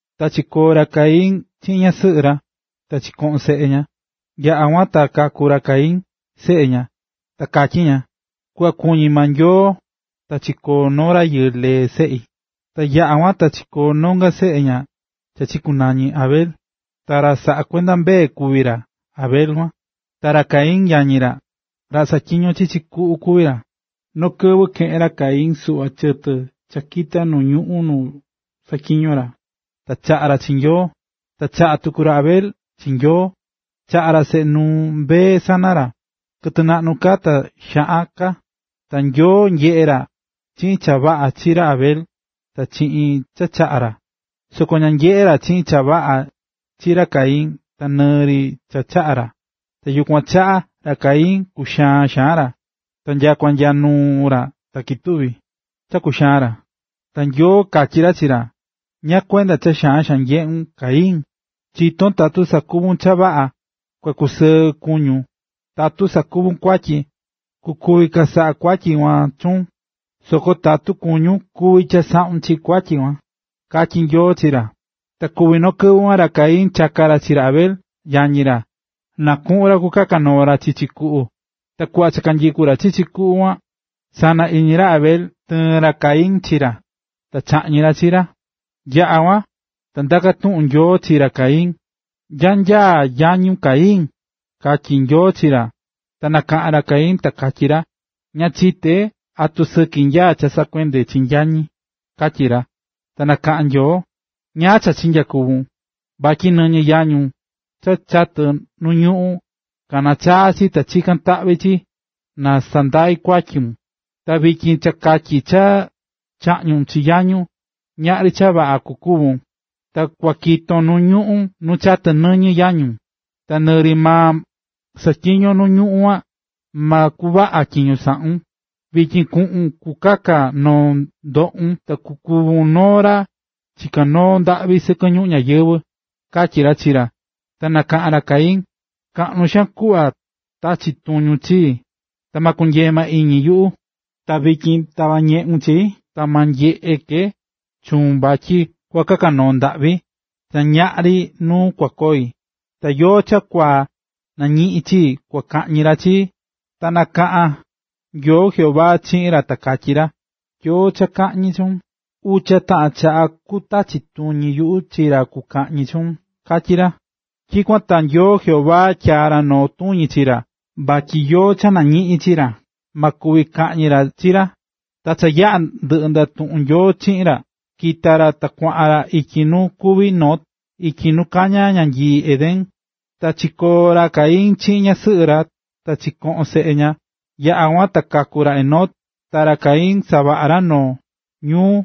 Ta chikoo̱ ra Adán chiꞌin ñasɨꞌɨ ra, ta chikoꞌo̱n seꞌe ña, yaꞌa̱ kuan ta kaku̱ ra Caín, seꞌe ña, ta katyí ña: “Kuꞌva kuñí maa Nyoo ta chikoo̱ noo rayɨɨ lee seꞌi.” Ta yaꞌa̱ kuan ta chikóo̱ nonga seꞌe ña cha chikunañi̱ Abel. Ta ra saꞌá kuenda mbee kuví ra Abel kuan. Ta ra Caín, yañi ra, ra saꞌatyiñó chichi kuꞌu kuví ra. Noo kɨvɨ keꞌe̱n ra Caín suꞌva chɨtɨ cha kita̱ nu ñuꞌún nu saꞌatyiñó ra, ta chaꞌa̱ ra chi Nyoo. Ta chaꞌa̱ tuku ra Abel chi Nyoo, chaꞌa̱ ra seꞌe nuu mbee sana ra, kɨtɨ naꞌnu ka ta xaꞌan ka. Ta Nyoo Jehová nyeꞌe̱ ra chiꞌin cha vaꞌa chi ra Abel ta chiꞌin cha chaꞌa̱ ra. Soko ña nyeꞌe̱ ra chiꞌin cha vaꞌa chi ra Caín ta nɨɨ ri cha chaꞌa̱ ra. Ta yukuan chaꞌa, ra Caín kuxaa̱n xaan ra, ta nyakua nya nuu ra ta ketuvi̱ cha kuxaán ra. Ta Nyoo katyí ra chi ra: “¿Ñáá kuenda cha xaan xaan nyeꞌún, Caín? Chitón tatu savaꞌún cha vaꞌa, kua kusɨɨ kuñún, ta tatu sakuvún kuatyi, kukuvi chasaꞌa kuatyi kuan chuun, soko tatu kuñún, kuvi chasaꞌun chi kuatyi kuan”, katyí ra Jehová chi ra. Ta kuvi̱ noo kɨvɨ kuan, ra Caín chaka̱ ra chi ra Abel, yañi ra, na kuꞌun ra kukaka noo ra chichi kuꞌu. Ta kuꞌva cha nyikú ra chichi kuꞌu kuan, sana iñi ra Abel, tɨɨ̱n ra Caín chi ra, ta chaꞌñi̱ ra chi ra. Yaꞌa̱ kuan, ta ndaka̱ tuꞌun Nyoo chi ra Caín: —¿Nyá nyaá yañun, Caín? ―katyí Nyoo chi ra. Ta nakaꞌa̱n ra Caín, ta katyí ra: ―Ña chité, ¿atu sɨki nyaá cha saꞌakuendé chi yañi? ―katyí ra. Ta nakaꞌa̱n Nyoo: —¿Ñáá cha chinyakuvu̱n? Vatyi nɨñɨ yañun cha chatɨ̱ nuu ñuꞌún, kaná chaa chi, ta chikán taꞌvi chi chii na sandai kuatyun. Ta vityin cha katyi cha chaꞌñu̱n chi yañun, ñaꞌri cha vaꞌa kukuvun. Ta kua kiton nu ñuꞌún nu chatɨ̱ nɨñɨ yañun. Ta nɨɨ ri maa saꞌatyiñón nu ñuꞌún kuan, ma kuvaꞌa tyiño saꞌún. Vityin kuꞌun kukaka noo ndoꞌun, ta kukuvun noo ra chiká noo ndaꞌvi sɨkɨ ñuꞌún ñayɨvɨ̱ ―katyí ra chi ra. Ta nakaꞌa̱n ra Caín: ―Kaꞌnu xaan kuꞌva tachí tuñun chii, ta ma kunyee maa iñi yuꞌu. Ta vityin tava̱ ñeꞌun chii, ta ma nyeꞌe ke chuun vatyi kua kaka noo ndaꞌvi, ta ñaꞌri nuu kua koi, ta yóó cha kua nañiꞌin chii, kua kaꞌñi ra chii. Ta nakaꞌa̱n Nyoo Jehová chiꞌin ra ta katyí ra: ―Yóó cha kaꞌñi chuun, ucha taꞌan chaꞌa kutachi tuñi yuꞌu chi ra kukaꞌñi chuun —katyí ra. Tyikuan ta Nyoo Jehová tyaa̱ ra noo tuñi chi ra, vatyi yóó cha nañiꞌin chi ra, ma kuvi kaꞌñi ra chi ra. Ta cha yaꞌa̱ ndɨꞌɨ̱ ndatuꞌún Nyoo chiꞌin ra, kita̱ ra ta kuaꞌan ra ityi nu kuví Nod ityi nu kañá ñanyii Edén. Ta chikoo̱ ra Caín chiꞌin ñasɨꞌɨ ra, ta chikoꞌo̱n seꞌe ña. Yaꞌa̱ kuan ta kaku̱ ra Enoc. Ta ra Caín savaꞌa̱ ra noo ñuu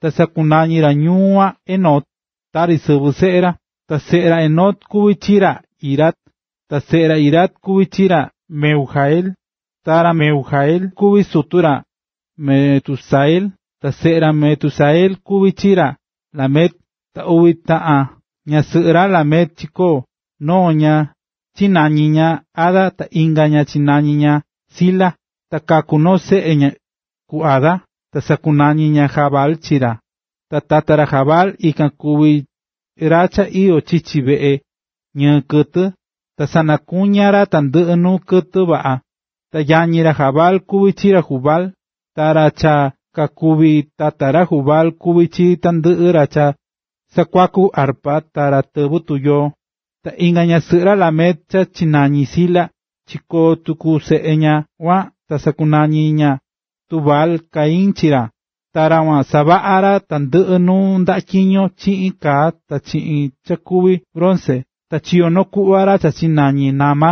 ta sakunañi̱ ra ñuu kuan “Enoc”, tari sɨvɨ seꞌe ra. Ta seꞌe ra Enoc kuví chi ra Irad, ta seꞌe ra Irad kuví chi ra Mehujael, ta ra Mehujael kuví sutu ra Metusael, ta seꞌe ra Metusael kuví chi ra Lamec. Ta uvi taꞌan ñasɨꞌɨ ra Lamec chikoo̱: noo ña chinañi̱ ña Ada, ta inga ña chinañi̱ ña Zila. Ta kaku̱ noo seꞌe ku Ada, ta sakunañi̱ ña Jabal chi ra. Ta tata ra Jabal ikan kuvi̱ ra cha iyó chichi veꞌe ñɨɨ kɨtɨ. Ta sanakuña̱ ra tandɨꞌɨ nuu kɨtɨ vaꞌa. Ta yañi ra Jabal kuví chi ra Jubal. Ta ra cha kakuvi̱ tata ra Jubal, kuvi̱ chi tandɨꞌɨ ra cha sakuakú arpa ta ra tɨvɨ́ tuyoo. Ta inga ñasɨꞌɨ ra Lamec cha chinañi̱ Zila, chikoo̱ tuku seꞌe ña kuan ta sakunañi̱ ña Tubal-Caín chi ra. Ta ra kuan savaꞌa̱ ra tandɨꞌɨ nuu ndaꞌa tyiño chiꞌin kaa ta chiꞌin cha kuví bronce. Ta chiyo̱ noo kuꞌva ra cha chinañi̱ Naama.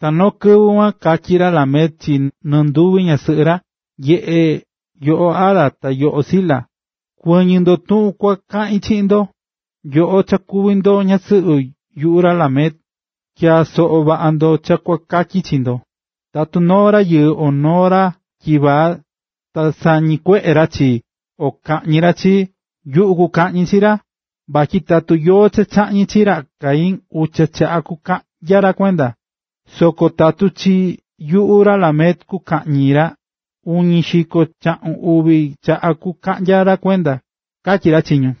Ta noo kɨvɨ kuan katyí ra Lamec chi nɨnduvi ñasɨꞌɨ ra: “Nye̱ꞌe yoꞌo Ada ta yoꞌo Zila. Kuɨ̱ñɨ ndo tuꞌun kua kaꞌin chiꞌin ndo, nyoꞌo cha kuví ndo ñasɨꞌɨ yuꞌu ra Lamec. Tya̱a soꞌo vaꞌa ndo cha kua katyi chi ndo: Tatu noo rayɨɨ o noo ra tyivaa, ta sañikueꞌe ra chii o kañi ra chii, yuꞌu kukaꞌñi chi ra. Vatyi tatu yóó cha kaꞌñi chi ra Caín, ucha chaꞌa kukaꞌnya ra kuenda, soko tatu chi yuꞌu ra Lamec kukaꞌñi ra, uñi xiko chaꞌun uvi chaꞌa kukaꞌnya ra kuenda”, katyí ra chi ñu.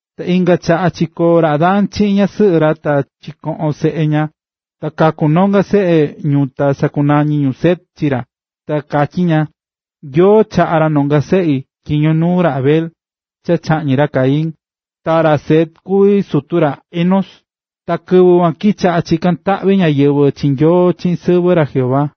Ta inga chaꞌa chikóo ra Adán chiꞌin ñasɨꞌɨ ra, ta chikoꞌo̱n seꞌe ña, ta kaku̱ nonga seꞌe ñu ta sakunañi̱ ñu Set chi ra. Ta katyí ña: “Nyoo chaꞌa̱ ra nonga seꞌi tyiño nuu ra Abel, cha chaꞌñi̱ ra Caín.” Ta ra Set kuví sutu ra Enós. Ta kɨvɨ kuan kichaꞌa̱ chikán taꞌvi ñáyɨvɨ chi Nyoo chiꞌin sɨvɨ ra “Jehová”.